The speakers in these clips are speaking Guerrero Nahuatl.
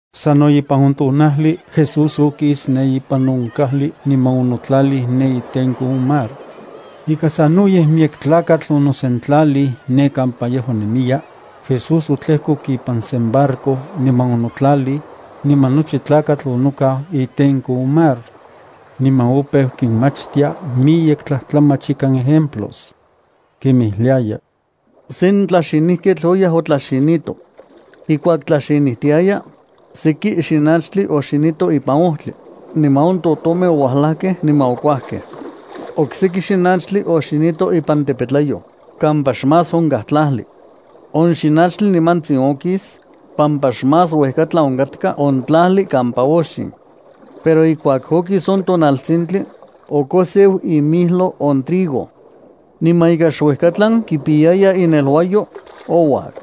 Sano ipan on tonajli, Jesús okis ne ipan on kajli niman onotlalij ne itenko on mar. Ika sanoyej miyek tlakatl onosentlalij ne kampa yejua nemiya, Jesús otlejkok ipan sen barco niman onotlalij, niman nochi tlakatl onokau itenko on mar. Niman opeu kinmachtia miyek tlajtlamach ikan ejemplos. Kinmijliaya: —Sen tlaxinijketl oyaj otlaxinito. Ijkuak tlaxinijtiaya, seki xinachtli oxinito ipan ojtli, niman on totomej oualajkej niman okuajkej. Okseki xinachtli oxinito ipan tepetlayoj kampa xmás onkaj tlajli. On xinachtli nimantsin okis, pampa xmás uejkatlan onkatka on tlajli kampa oxin. Pero ijkuak okis on tonaltsintli, okoseu imilyo on trigo. Niman ika xuejkatlan kipiyaya ineluayo, ouak.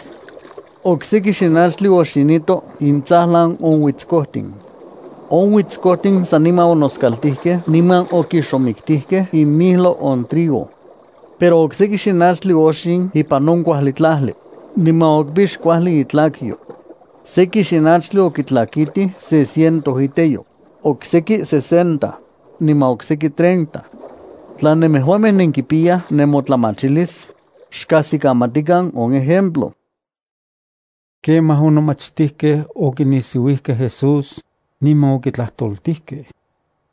Okseki xinachtli oxinito intsajlan on uitskojtin. On uitskojtin saniman onoskaltijkej niman okixomiktijkej imijlo on trigo. Pero okseki xinachtli oxin ipan on kuajli tlajli, niman okipix kuajli itlakyo. Seki xinachtli okitlakitij se ciento iteyo, okseki sesenta, niman okseki treinta. Tla nemejuamej nenkipiyaj nemotlamachilis, xkajsikamatikan on ejemplo. Kemaj on nomachtijkej okinisiuijkej Jesús, niman okitlajtoltijkej: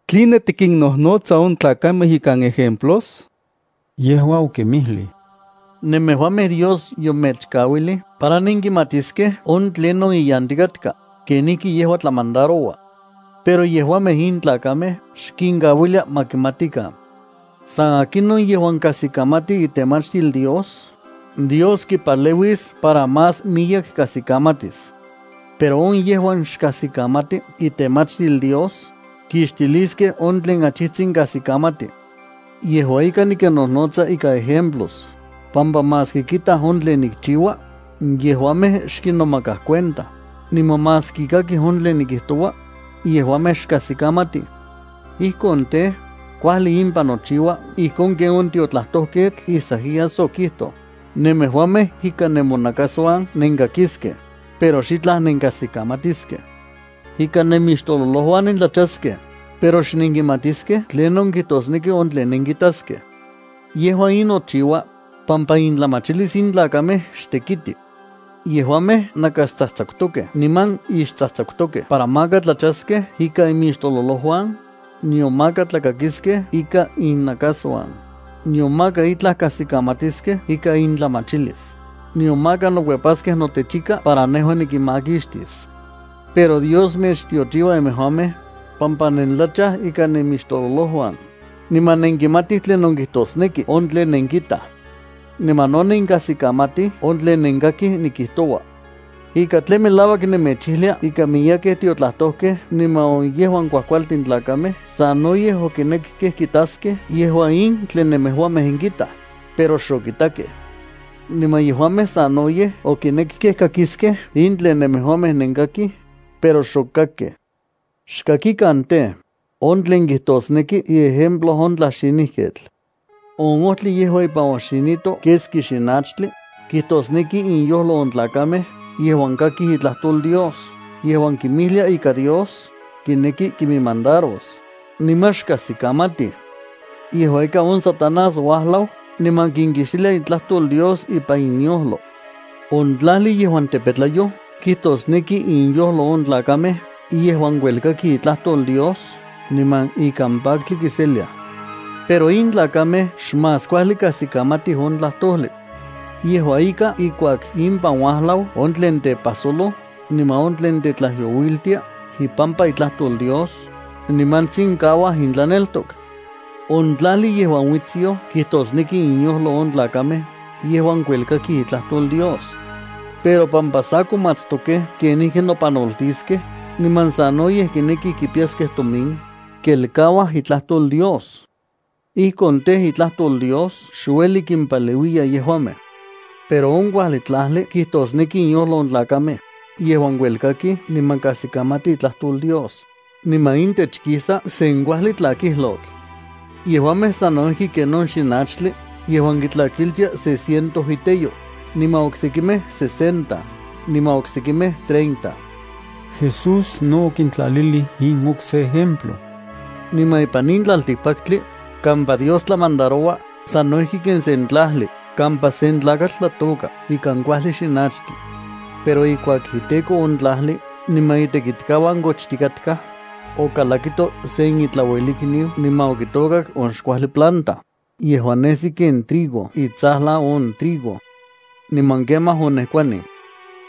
—¿Tline tikinnojnotsa on tlakamej ikan ejemplos? Yejua okinmijlij: —Nemejuamej Dios yomechkauilij para nenkimatiskej on tlinon iyantikatka kenijki yejua tlamandaroua. Pero yejuamej in tlakamej xkinkauilia ma kimatikan. San akinon yejuan kajsikamati itemachtil Dios, Dios kipaleuis para más miyek kajsikamatis. Pero on yejuan xkajsikamati itemachtil Dios, kixtiliskej on tlen achijtsin kajsikamati. Yejua ika nikinnojnotsa ikan ejemplos, pampa maski kitaj on tlen nikchiua, yejuamej xkinomakaj cuenta, niman maski kakij on tlen nikijtoua, yejuamej xkajsikamatij. Ijkon tej, kuajli impan nochiua ijkon ken on tiotlajtojketl Isaías okijtoj: Nemejuamej ikan nemonakasuan nenkakiskej, pero xitlaj nenkajsikamatiskej. Ikan nemixtololojuan nentlachaskej, pero xnenkimatiskej tlinon kijtosneki on tlen nenkitaskej. Yejua in nochiua, pampa intlamachilis in tlakamej xtekiti. Yejuamej nakastsajtsakutokej niman ixtsajtsakutokej para maka tlachaskej ikan imixtololojuan, nion maka tlakakiskej ikan innakasuan, nion maka itlaj kajsikamatiskej ikan intlamachilis, nion maka nokuepaskej notechika para nejua nikinmakixtis. ’Pero Dios mechtiochiua nemejuamej, pampa nentlachaj ikan nemixtololojuan, niman nenkimatij tlinon kijtosneki on tlen nenkitaj. Niman no nenkajsikamatij on tlen nenkakij nikijtoua. Ika tlen melauak nemechijlia ika miyekej tiotlajtojkej niman on yejuan kuajkualtin tlakamej sanoyej okinekkej kitaskej yejua in tlen nemejuamej nenkitaj, pero xokitakej. Niman yejuamej sanoyej okinekkej kakiskej in tlen nemejuamej nenkakij, pero xokakkej. ’Xkakikan tej, on tlen kijtosneki iejemplo on tlaxinijketl. On ojtli yejuan ipan oxinito keski xinachtli kijtosneki inyojlo on tlakamej yejuan kakij itlajtol Dios yejuan kinmijlia ika Dios kineki kinmandaros, niman xkajsikamatij. Yejua ika on Satanás uajlau niman kinkixtilia itlajtol Dios ipan inyojlo. On tlajli yejuan tepetlayoj kijtosneki inyojlo on tlakamej yejuan kuelkakij itlajtol Dios niman ikan paktli kiseliaj. Pero in tlakamej xmás kuajli kajsikamatij on tlajtojli. Yejua ika, ijkuak impan uajlau on tlen tepajsoloj niman on tlen tetlajyouiltia ipampa itlajtol Dios, nimantsin kauaj intlaneltok. On tlajli yejuan uitsyoj kijtosneki inyojlo on tlakamej yejuan kuelkakij itlajtol Dios. Pero pampa sa komatstokej kenijki nopanoltiskej niman sanoyej kinekij kipiyaskej tomin, kelkauaj itlajtol Dios. Ijkon tej, itlajtol Dios xueli kimpaleuiya yejuamej. Pero on kuajli tlajli kijtosneki inyojlo on tlakamej yejuan kuelkakij niman kajsikamatij itlajtol Dios, niman intech kisa sen kuajli tlakijlotl. Yejuamej sano ijki ken on xinachtli yejuan kitlakitiaj se ciento iteyo, niman oksekimej sesenta, niman oksekimej treinta. Jesús no okintlalilij in okse ejemplo: —Niman ipan in tlaltikpaktli kampa Dios tlamandaroua sano ijki ken sen tlajli kampa sen tlakatl tlatôka ikan kuajli xinachtli. Pero ijkuak iteko on tlajli niman itekitkauan kochtikatkaj, okalakito sen itlauelikniu niman okitôkak on xkuajli planta yejuan nesi ken trigo itsajlan on trigo. Niman kemaj onejkuanij.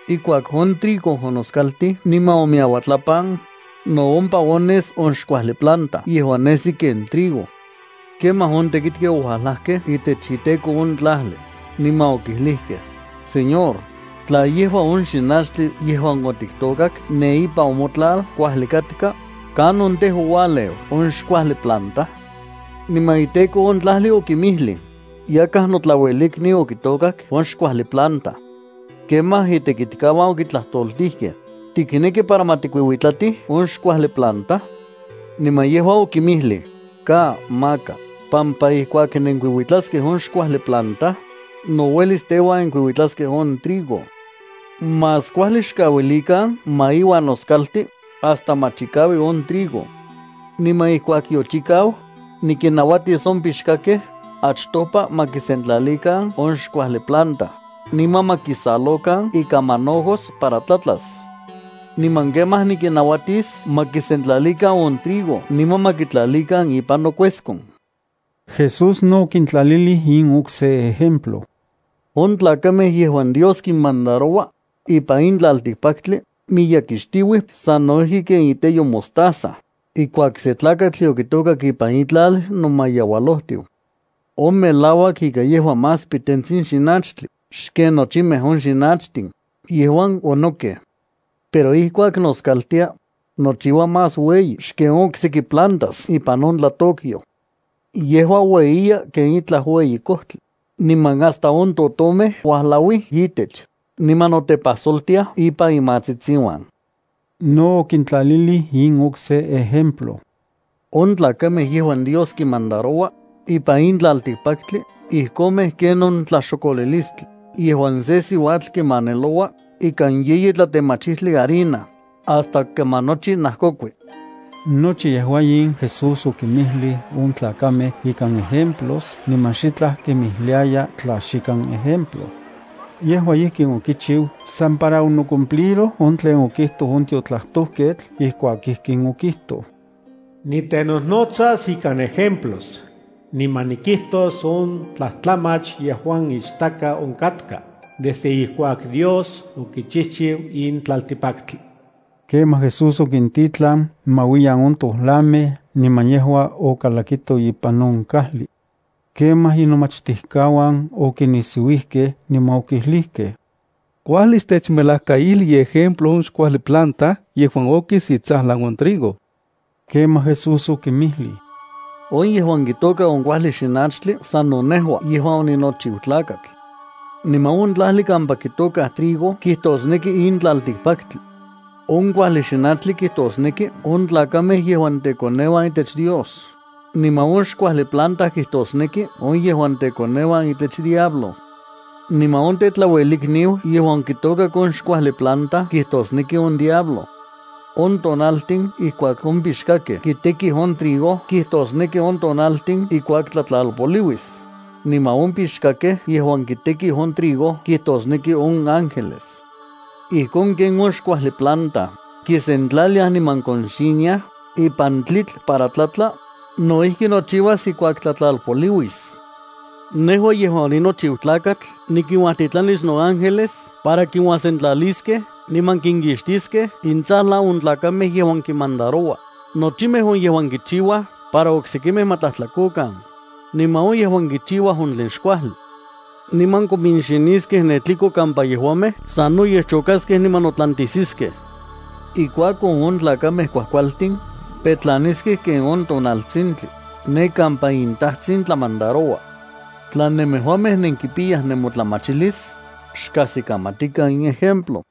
Ijkuak on trigo onoskaltij niman omiyauatlapan, no ompa ones on xkuajli planta yejuan nesi ken trigo. Kemaj on tekitkej oualajkej itech on iteko on tlajli, niman okijlijkej: “Señor, tla yejua on xinachtli yejuan otiktôkak ne ipan on motlal kuajli katka, ¿kanon, tej, oualeu on xkuajli planta?” Niman iteko on tlajli okinmijlij: “Yakaj notlauelikniu okitôkak on xkuajli planta.” Kemaj itekitkauan okitlajtoltijkej: “¿Tikneki para ma tikuiuitlatij on xkuajli planta?” Niman yejua okinmijlij: “Ka, maka pampa ijkuak nenkuiuitlaskej on xkuajli planta, no uelis teuan nenkuiuitlaskej on trigo. Más kuajli xkauilikan ma iuan noskalti hasta ma chikaui on trigo. Niman ijkuak yochikau, nikinnauatis on pixkakej achtopa ma kisentlalikan on xkuajli planta niman ma kisalokan ikan manojos para tlatlas. Niman kemaj nikinnauatis ma kisentlalikan on trigo niman ma kitlalikan ipan nokueskon.” Jesús no okintlalilij in okse ejemplo: —On tlakamej yejuan Dios kinmandaroua ipan in tlaltikpaktli miyekixtiuij sano ijki ken iteyo mostaza ijkuak sen tlakatl yokitôkak ipan itlal nomayeualojtiu. On melauak ika yejua más pitentsin xinachtli xken nochimej on xinachtin yejuan onokaj. Pero ijkuak noskaltia, nochiua más ueyi xken on okseki plantas ipan on tlatôkyoj. Yejua ueyiya ken itlaj ueyi kojtli, niman hasta on totomej uajlauij itech niman notepajsoltiaj ipan imatsitsiuan. No okintlalilij in okse ejemplo: —On tlakamej yejuan Dios kinmandaroua ipan in tlaltikpaktli ijkomej ken on tlaxokolilistli yejuan sen siuatl kimaneloua ikan yeyi tlatemachitli harina hasta kaman nochi najkokui. Nochi yejua in Jesús okinmijlij on tlakamej ikan ejemplos niman xitlaj kinmijliaya tla xikan ejemplo. Yejua ijkin okichiu san para onocumpliroj on tlen okijtoj on tiotlajtojketl ijkuak ijkin okijtoj: Nitenojnotsas ikan ejemplos, niman nikijtos on tlajtlamach yejuan ichtaka onkatka desde ijkuak Dios okichijchiu in tlaltikpaktli. Kemaj Jesús okintitlan ma uiyan on tolamej niman yejua okalakito ipan on kajli. Kemaj inomachtijkauan okinisiuijkej, niman okijlijkej: —Kuajli xtechmelajkaijli iejemplo on xkuajli planta yejuan okis itsajlan on trigo. Kemaj, Jesús okinmijlij: —On yejuan kitôka on kuajli xinachtli, sano nejua yejuan oninochiu Tlakatl, niman on tlajli kampa kitôka trigo kijtosneki in tlaltikpaktli. On kuajli xinachtli kijtosneki on tlakamej yejuan tekoneuan itech Dios, niman on xkuajli planta kijtosneki on yejuan tekoneuan itech diablo. Niman on tetlauelikniu yejuan okitokak on xkuajli planta kijtosneki on diablo. On tonaltin ijkuak on pixkakej kitekij on trigo kijtosneki on tonaltin ijkuak tlatlalpoliuis, niman on pixkakej yejuan kitekij on trigo kijtosneki on ángeles. Ijkon ken on xkuajli planta kisentlaliaj niman konxiniaj ipan tlitl para tlatla, no ijki nochiuas ijkuak tlatlalpoliuis. Nejua yejuan oninochiu Tlakatl nikinuajtitlanis noángeles para kinuajsentlaliskej niman kinkixtiskej intsajlan on tlakamej yejuan nikinmandaroua, nochimej on yejuan kichiuaj para oksekimej ma tlajtlakokan, niman on yejuan kichiuaj on tlen xkuajli. Niman kominxiniskej ne tliko kampa yejuamej sanoyej chokaskej niman notlantijsiskej. Ijkuakon, on tlakamej kuajkualtin petlaniskej ken on tonaltsintli ne kampa inTajtsin tlamandaroua. Tla nemejuamej nenkipiyaj nemotlamachilis, xkajsikamatikan in ejemplo.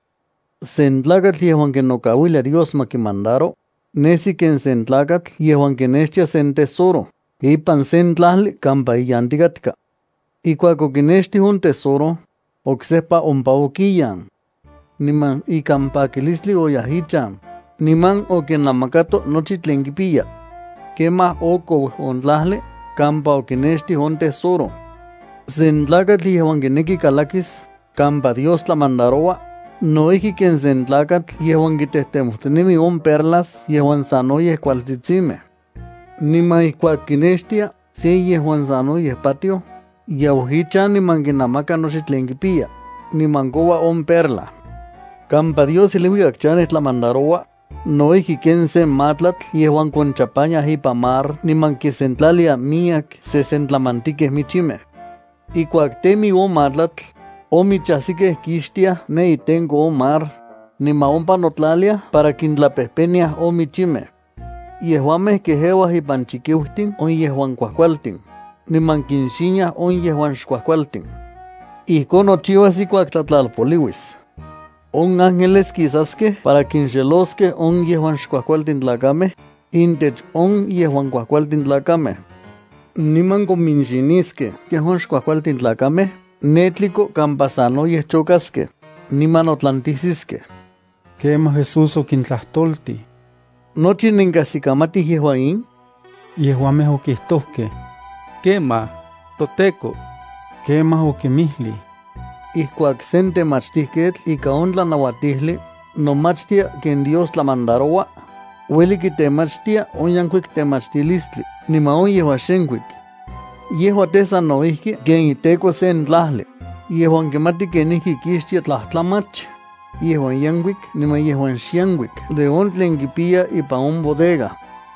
’Sen tlakatl yejuan kinokauilia Dios ma kimandaro, nesi ken sen tlakatl yejuan okinextij sen tesoro ipan sen tlajli kampa iyantikatka. Ijkuak okinextij on tesoro, oksejpa ompa okiyan. Niman ikan pakilistli oyaj ichan, niman okinamakato nochi tlen kipiya. Kemaj okou on tlajli kampa okinextij on tesoro. ’Sen tlakatl yejuan kineki kalakis kampa Dios tlamandaroua, no ijki ken sen tlakatl yejuan kitejtemojtinemi on perlas yejuan sanoyej kualtsitsimej. Niman ijkuak kinextia se yejuan sanoyej patioj, yau ichan, niman kinamaka nochi tlen kipiya, niman koua on perla. ’Kampa Dios iluikak chanej tlamandaroua, no ijki ken sen matlatl yejuan konchapaniaj ipan mar niman kisentlalia miyek sesentlamantikej michimej. Ijkuak temi on matlatl, on michajsikej kixtiaj ne itenko on mar, niman ompa notlaliaj para kintlapejpeniaj on michimej. Yejuamej kejeuaj ipan chikiutin on yejuan kuajkualtin, niman kinxiniaj on yejuan xkuajkualtin. Ijkon nochiuas ijkuak tlatlalpoliuis. On ángeles kisaskej para kinxeloskej on yejuan xkuajkualtin tlakamej intech on yejuan kuajkualtin tlakamej. Niman kominxiniskej yejuan xkuajkualtin tlakamej ne tliko kampa sanoyej chokaskej niman notlantisiskej. Kemaj Jesús okintlajtoltij: —¿Nochi nenkajsikamatij yejua in? Yejuamej okijtojkej: —Kemaj, toTEKO. Kemaj okinmijlij: —Ijkuak sen temachtijketl ika on tlanauatijli nomachtia ken Dios tlamandaroua, ueli kitemachtia on yenkuik temachtilistli niman on yejuan xenkuik. Yejua tej, sano ijki ken iteko sen kajli yejuan kimati kenijki kixtia tlajtlamach yejuan yenkuik niman yejuan xenkuik de on tlen kipiya ipan on bodega.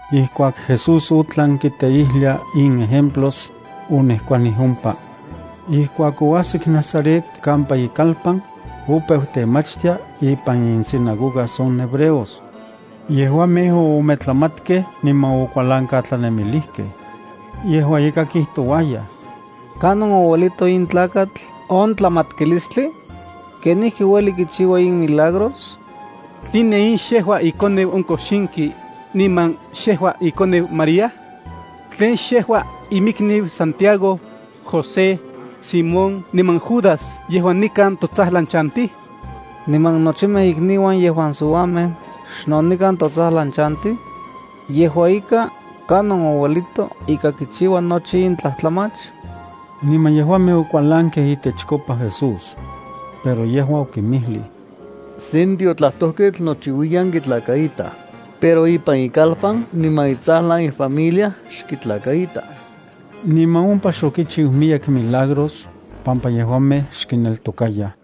Ijkuak Jesús otlan kiteijlia in ejemplos, onejkuani ompa. Ijkuak oajsik Nazaret kampa ikalpan, opeu temachtia ipan insinagogas on hebreos. Yejuamej oometlamatkej niman okualankatlanemilijkej. Yejua ika kijtouayaj: —¿Kanon ouelito in tlakatl on tlamatkilistli? ¿Kenijki ueli kichiua in milagros? ¿Tline in xejua ikoneu on kojxinki, niman xejua inanaj María? ¿Tlen xejua iminikniu Santiago, José, Simón niman Judas yejuan nikan totsajlan chantij? ¿Niman nochimej ikniuan yejuan siuamej xno nikan totsajlan chantij? Yejua ika, ¿kanon ouelito ika kichiua nochi in tlajtlamach? Niman yejuamej okualankej itechkopa Jesús. Pero yejua okinmijlij: —Sen tiotlajtojketl nochiuiyan kitlakaitaj, pero ipan ikalpan niman itsajlan ifamilia xkitlakaitaj. Niman ompa xokichiu miyek milagros, pampa yejuamej xkineltokayaj.